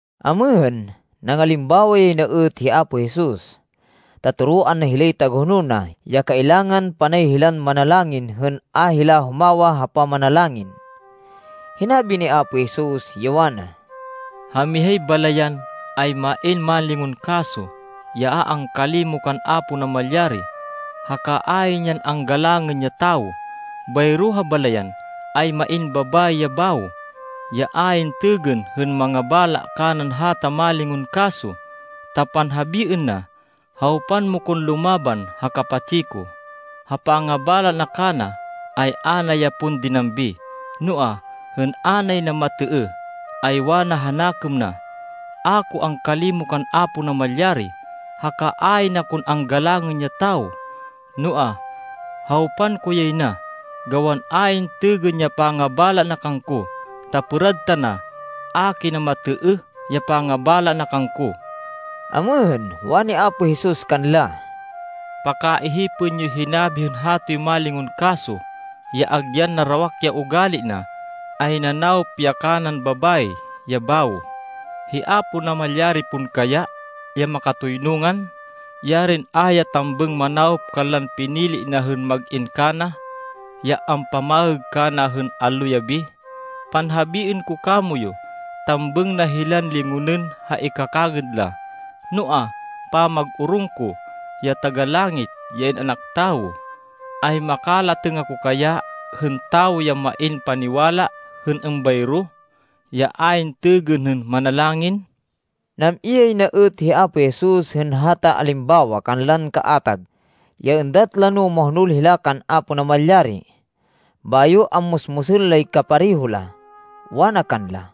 Amêhên, nangalimbawa yay na êt hi Apo Jesus, ta toroan na hilay tagahonol na ya kailangan panay hilan manalangin hên a hila humawa ha pamanalangin. Hinabi ni Apo Jesus, ya wana, “Ha mihay balayan, ay main mánlingon kaso ya a angkalimo kan Apo Namalyari, haka ayn yan anggalangên ya tawo. Bayro ha balayan, ay main babayi ya bawo, ya ayn têgên hên mangabala kanan hata mánlingon kaso, ta panhabiên na, ‘Hawpan mo kon lumaban ha kapatsi ko.’ Ha pangabala na kana, ay a na ya pon dinambi, noa, hên a nay na matêêh, ay wana ha nakêm na, ‘A ko angkalimo kan Apo Namalyari, haka ayn akon anggalangên ya tawo, noa, hawpan ko yay na, gawan ayn têgên ya pangabala na kangko, ta pêrad tana, a kina matêêh ya pangabala na kangko.’” Amêhên, wani Apo Jesus kanla, “Pakaihipên yoy hinabi hên hatoy mánlingon kaso ya agyan narawak ya ugali na, ay nanawop ya kanan babayi ya bawo. Hi Apo Namalyari pon kaya, ya makatoynungan, yarin a ya tambêng manawop kanlan pinili na hên mag-in kana, ya ampamaêg kana hên allo-yabi. Panhabiên ko kamoyu, tambêng na hilan lingonên ha ikakangêd la. Noa, pamag-orong ko, ya Taga-Langit, ya In-anak Tawo, ay makalatêng ako kaya hên tawo ya main paniwala hên êmbayro, ya ayn têgên hên manalangin?” Nam-i yay na êt hi Apo Jesus hên hata alimbawa kanlan kaatag, ya êndat la no mahonol hila kan Apo Namalyari, bayo ammusmusên lay kapareho la. Wana kanla,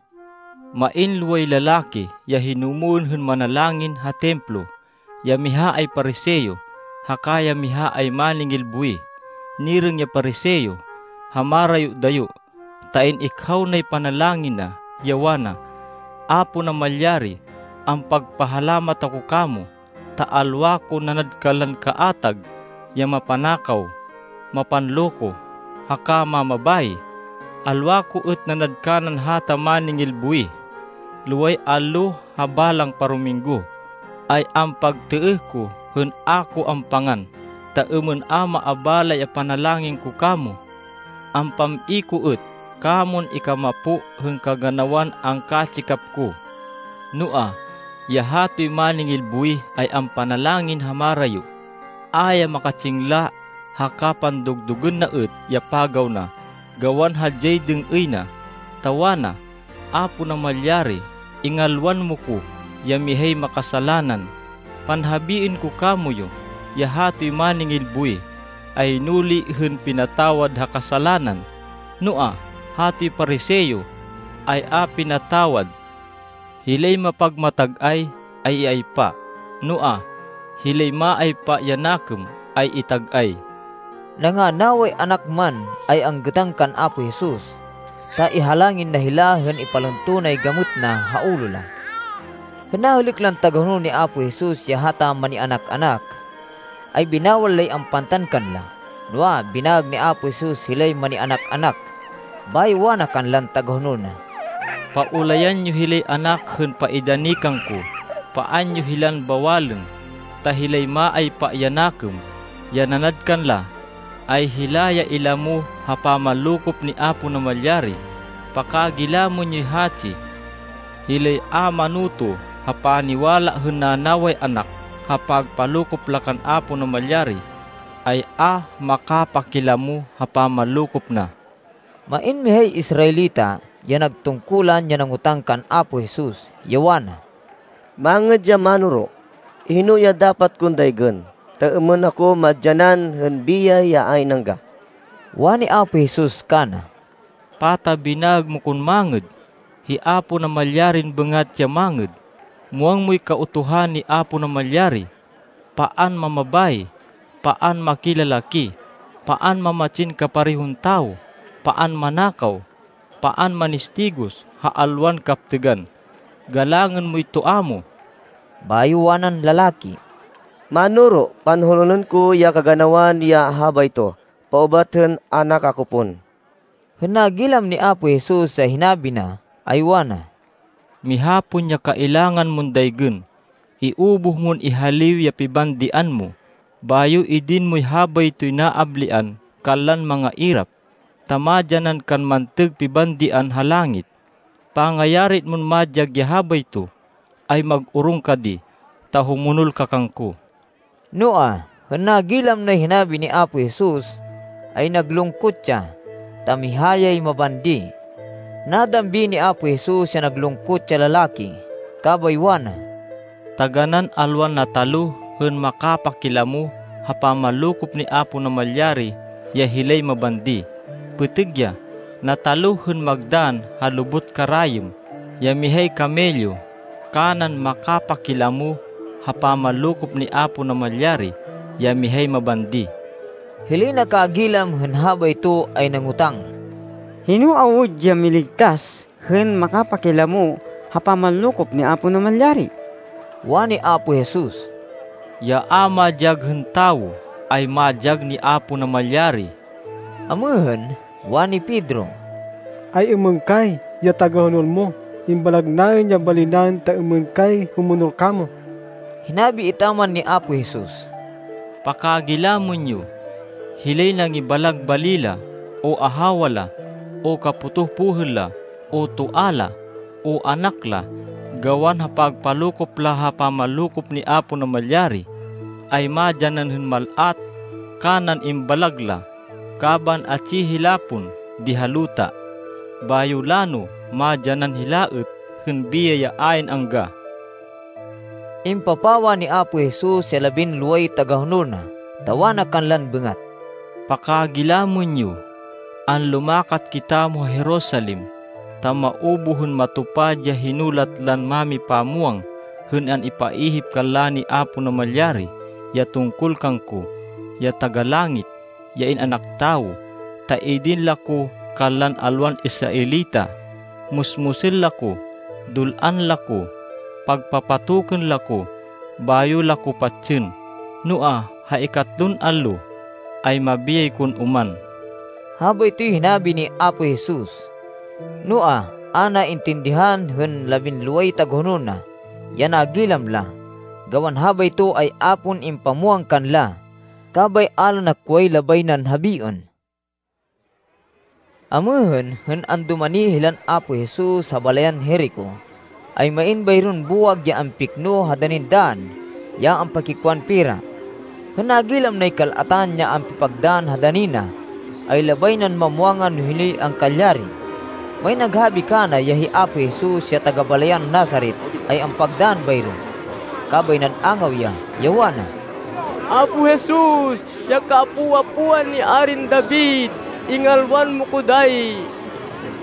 “Main loway lalaki ya hinumwên hên manalangin ha Templo. Ya miha ay Pariseo, haka ya miha ay máningil buwih. Nirêng ya Pariseo ha marayo-dayo, ta in-ikhaw nay panalangin na, ya wana, ‘Apo Namalyari, ampagpahalamat ako kamo, ta alwa kon nanad kanlan kaatag ya mapanakaw, mapanloko, haka mamabayi. Alwa ko êt nanad kanan hata máningil buwih. Loway allo ha balang parominggo, ay ampagtêêh ko hên a ko ampangan, ta êmên a maabala ya panalangin ko kamo. Ampam-i ko êt kamon ikamapo hên kaganawan angkatsikap ko.’ Noa, ya hatoy máningil buwih, ay ampanalangin ha marayo. A ya makatsingla, haka pandug-dugên na êt ya pagaw na gawan hadyay dêng-êy na, ta wana, ‘Apo Namalyari, ingalwan mo ko, ya mihay makasalanan.’ Panhabiên ko kamoyu ya hatoy máningil buwih, ay nuli hên pinatawad ha kasalanan, noa, hatoy Pariseo, ay a pinatawad. Hilay mapagmatag-ay, ay iaypa, noa, hilay maaypa ya nakêm ay itag-ay.” Nanganaway anak man, ay anggêtan kan Apo Jesus, ta ihalangin na hila hên ipalunto nay gamêt na ha ulo la. Hên nahêlêk lan tagahonol ni Apo Jesus ya hata manianak-anak, ay binawal lay ampantan kanla. Noa, binaêg ni Apo Jesus hilay manianak-anak, bayo wana kanlan tagahonol na, “Paulayan yo hilay anak hên paidani kangko. Paan yo hilan bawalên. Ta hilay maaypa ya nakêm ya nanad kanla, ay hila ya ilamo ha pamanlokop ni Apo Namalyari. Pakagilamên yoy hatsi. Hilay a manoto ha paniwala hên nanaway anak ha pagpalokop la kan Apo Namalyari, ay a makapakilamo ha pamanlokop na.” Main mihay Israelita, ya nagtungkulan, ya nangotang kan Apo Jesus, ya wana, “Mangêd ya Mánoro, hino ya dapat kon daygên, ta êmên ako madyanan hên biyay ya ayn angga?” Wani Apo Jesus kana, “Pata binaêg mo kon mangêd? Hi Apo Namalyarin bêngat ya mangêd. Muwang moy Kautuhan ni Apo Namalyari, ‘Paan mamabayi. Paan makilalaki. Paan mamatsin kaparehon tawo. Paan manakaw. Paan manistigos ha alwan kaptêgan. Galangên moy toa mo.’” Bayo wanan lalaki, “Mánoro, panhonolên ko ya kaganawan ya habayto paubat hên anak ako pon.” Hên nagilam ni Apo Jesus ya hinabi na, ay wana, “Miha pon ya kailangan mon daygên. Iubuh mon ihaliw ya pibandian mo, bayo idin moy habaytoy naablian kanlan mangairap, ta madyanan kan mantêg pibandian ha langit. Pangayari mon madyag ya habayto, ay mag-orong ka di, ta humonol ka kangko.” Noa, hên nagilam nay hinabi ni Apo Jesus, ay naglungkot ya, ta miha yay mabandi. Nadambi ni Apo Jesus ya naglungkot ya lalaki, kabay wana, “Taganán alwan nataluh hên makapakilamo ha pamanlokop ni Apo Namalyari ya hilay mabandi! Pêtêg ya. Nataluh hên magdann ha lubot karayêm ya mihay kamelyo kanan makapakilamo ha pamanlokop ni Apo Namalyari ya mihay mabandi.” Hilay nakagilam hên habayto, ay nangotang, “Hino awud ya miligtas, hên makapakilamo ha pamanlokop ni Apo Namalyari?” Wani Apo Jesus, “Ya a madyag hên tawo, ay madyag ni Apo Namalyari.” Amêhên, wani Pedro, “Ay-êmên kay, ya tagahonol mo? Imbalag naên ya bali naên, ta êmên kay humonol kamo.” Hinabi etaman ni Apo Jesus, “Pakagilamên yo! Hilay nangibalag bali la, o ahawa la, o kapotoh pohêl la, o toa la, o anak la, gawan ha pagpalokop la ha pamanlokop ni Apo Namalyari, ay madyanan hên mal-at kanan imbalag la, kaban atsi hila pon di ha luta. Bayo lano madyanan hila êt hên biyay ya ayn angga.” Impapawa ni Apo Jesus ya labinloway tagahonol na, ta wana kanlan bêngat, “Pakagilamên yo! Anlumakat kitamo ha Jerusalem, ta maubuh hên matupad ya hinulat lan mámipamwang hên an-ipaihip kanla ni Apo Namalyari ya tungkol kangko, ya Taga-Langit, ya In-anak Tawo. Ta idin la ko kanlan alwan Israelita. Musmusên la ko, dul-an la ko, pagpapatokên la ko, bayo la ko patsên. Noa, ha ikatlon allo, ay mabiyay kon oman!” Habaytoy hinabi ni Apo Jesus. Noa, a naintindihan hên labinloway tagahonol na, ya nagilam la, gawan habayto ay a pon impamwang kanla, kabay a la nakway labay nan habiên. Amêhên, hên andumani hilan Apo Jesus ha balayan Jerico, ay main bayron buwag ya ampikno ha danin dann ya ampakikwan pera. Hên nagilam nay kal-atan ya ampipagdann ha dani na, ay labay nan mamwangan no hinoy angkalyari. Main naghabi kana ya hi Apo Jesus ya taga-balayan Nazaret ay ampagdann bayro. Kabay nan-angaw ya, ya wana, “Apo Jesus, ya kaapo-apoan ni Arin David, ingalwan mo ko dayi!”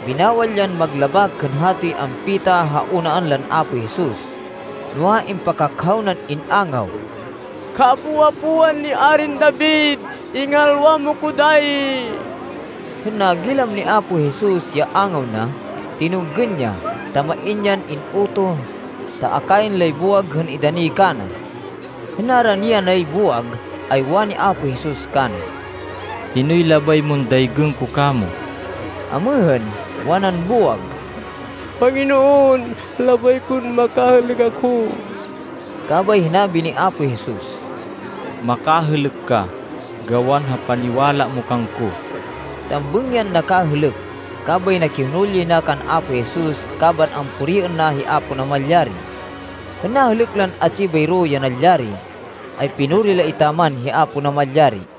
Binawal yan maglabak hên hatoy ampita ha unaan lan Apo Jesus, noa, impakakhaw nan in-angaw, “Kaapo-apoan ni Arin David, ingalwan mo ko dayi!” Hên nagilam ni Apo Jesus ya angaw na, tinunggên ya ta main yan in-utoh, ta akayên lay buwag hên idani kana. Hên narani yanay buwag, ay wani Apo Jesus kana, “Hinoy labay mon daygên ko kamo?” Amêhên, wanan buwag, “Panginoon, labay kon makahêlêk ako.” Kabay hinabi ni Apo Jesus, “Makahêlêk ka, gawan ha paniwala mo kangko.” Tambêng yan nakahêlêk, kabay nakihonol yay na kan Apo Jesus kaban ampuriên na hi Apo Namalyari. Hên nahêlêk lan atsi bayro ya nalyari, ay pinuri la etaman hi Apo Namalyari.